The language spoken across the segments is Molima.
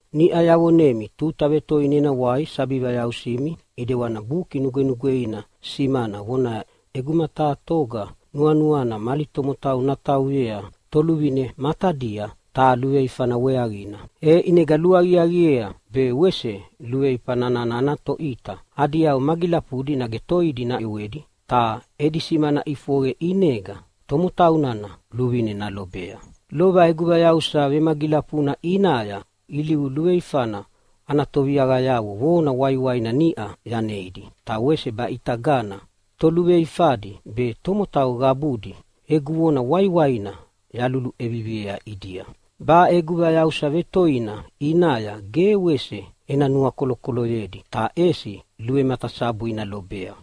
Niʼa yavonemi tuta vetoina ena wai sabi vayausimi. ʼIdewani Buki Nugwenugweina simana vonaya, “ʼEguma taha toga nuanuana mali tomotau natauyea toluvine matadia taha luveifana weaqina, e ʼinega luaqiaqiea be wese luveifa nana ana toʼita adi yau magilafudi nage toidi naʼewedi, ta edi simana ʼifoqe ʼinega tomotau nana luvine nalobea.” Lova egu vayausa vemagilafuna ʼinaya ilivu luveifana ana toviaqayavo vona waiwaina niʼa yaneidi. Ta wese baʼitagana toluveifadi be tomotau qabudi egu vona waiwaina yaluluʼeviviea ʼidia: Baʼe egu vayausa vetoina ʼinaya ge wese ena nuakolokoloyedi, ta ʼesi luvematasabu ina lobea.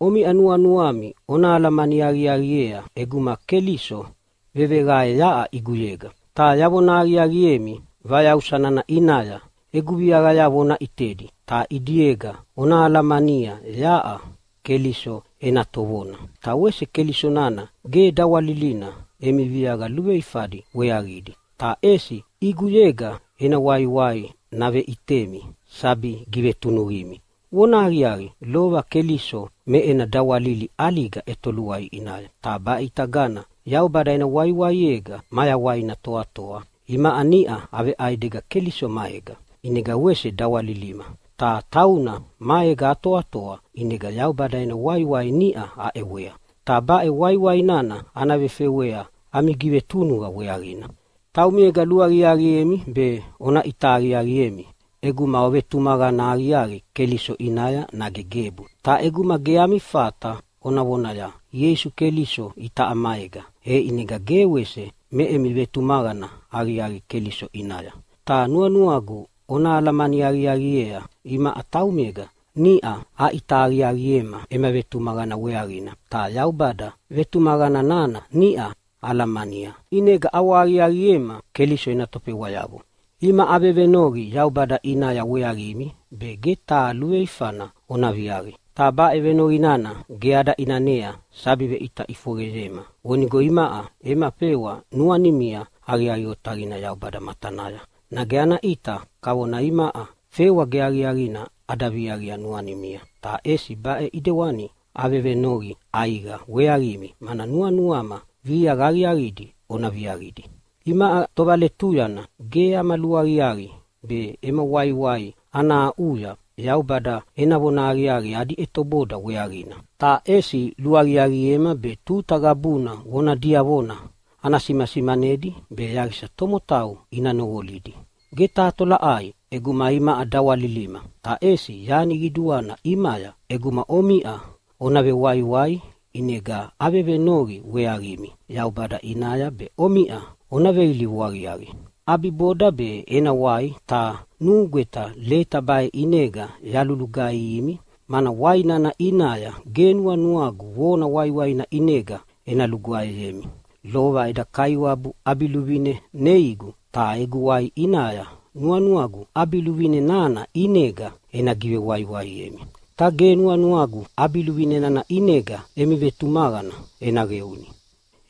Omiʼa nuanuami ona alamani aqiaqiea ʼeguma Keliso veveqae yaʼa ʼiguyega. Ta yavona aqiaqiemi, vayausa nana ʼinaya egu viaqayavo ona ʼitedi, ta ʼidiega ona alamania yaʼa Keliso ena tovona. Ta wese Keliso nana ge dawalilina emi viaqa luveifadi weaqidi, ta ʼesi ʼiguyega ena waiwai naveʼitemi sabi givetunuqimi. Vonahaqiaqi, lova Keliso me ena dawalili ʼaliga ʼetoluai ʼinaya, ta baʼitagana Yaubada ena waiwaiega mayawaina toatoa. Imaʼa niʼa aveʼaidega Keliso maega, ʼinega wese dawalilima, ta tauna maega atoatoa ʼinega Yaubada ena waiwai niʼa aʼewea, ta baʼe waiwai nana ana vefewea ami givetunuqa weaqina. Taumiega luaqiaqiemi be ona ʼita aqiaqiemi ʼeguma ovetumaqana aqiaqi Keliso ʼinaya, nage gebu. Ta ʼeguma ge ami fata ona vonaya, “Ieisu Keliso itaʼa maega!” e ʼinega ge wese me emi vetumaqana aqiaqi Keliso ʼinaya. Ta nuanuagu ona alamani aqiaqiea imaʼa taumega niʼa aʼita aqiaqiema ema vetumaqana weaqina, ta Yaubada vetumaqana nana niʼa alamania ʼinega ʼawahaqiaqiema Keliso ena tofewayavo. Imaʼa avevenoqi Yaubada ʼinaya weaqimi be ge taha luveifana ona viaqi. Ta baʼe venoqi nana ge ada ʼinanea sabi veʼita ʼifoqeyema vonigo imaʼa ema fewa nuanimia aqiaqi otaqina Yaubada matanaya. Nage ana ʼita kavona imaʼa fewa ge aqiaqina ada viaqia nuanimia, ta ʼesi baʼe ʼidewani avevenoqi ʼaiqa weaqimi, mana nuanuama viaqa aqiaqidi ona viaqidi. Imaʼa tovaletuyana ge ama luaqiaqi be ema waiwai ana aʼuya Yaubada ena vonahaqiaqi adi ʼetoboda weaqina, ta ʼesi luaqiaqiema be tuta qabuna vona diavona ana simasimanedi be yaqisa tomotau ina noqolidi. Ge taha tolaʼai ʼeguma imaʼa dawalilima, ta ʼesi yani qiduana ʼimaya ʼeguma omiʼa ona vewaiwai. ʼInega avevenoqi weaqimi Yaubada ʼinaya be omiʼa ona veilivu aqiaqi. ʼAbiboda be ena wai, ta nugweta leta baʼe ʼinega yalulugaihimi, mana wai nana ʼinaya ge nuanuagu vona waiwaina ʼinega ena lugwaeyemi. Lova eda Kaiwabu ʼabiluvine neigu, ta egu wai ʼinaya nuanuagu ʼabiluvine nana ʼinega ena givewaiwaiemi, ta ge nuanuagu ʼabiluvine nana ʼinega emi vetumaqana ena qeuni.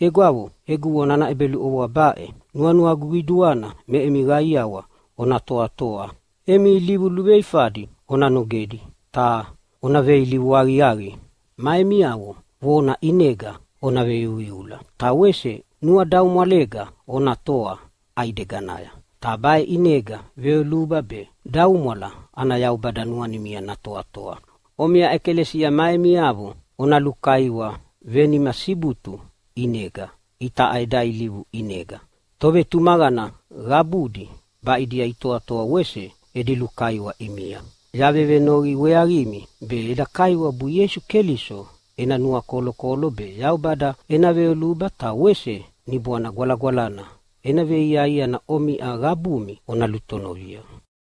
Egwavo, egu vona ana ʼebeluʼovoa baʼe: Nuanuagu qiduana me emi qaiawa ona toatoa. Emi ilivu luveifadi ona nogedi ta ona veilivu aqiaqi. Ma emiavo vona ʼinega ona veiuiula. Ta wese nuadaumwalega ona toa ʼaideganaya. Ta baʼe ʼinega veyoluba be daumwala ana Yaubada nuanimia natoatoa. Omiʼa ʼekalesia ma emiavo ona lukaiwa venima sibutu ʼinega itaʼa eda ilivu ʼinega. Tovetumaqana qabudi baʼidia itoatoa wese edi lukaiwa ʼimia. Yavevenoqi weaqimi be eda Kaiwabu Ieisu Keliso ena nuakolokolo be, Yaubada ena veyoluba ta wese Niboana Gwalagwalana ena veiaiana omiʼa qabumi ona lutonovia.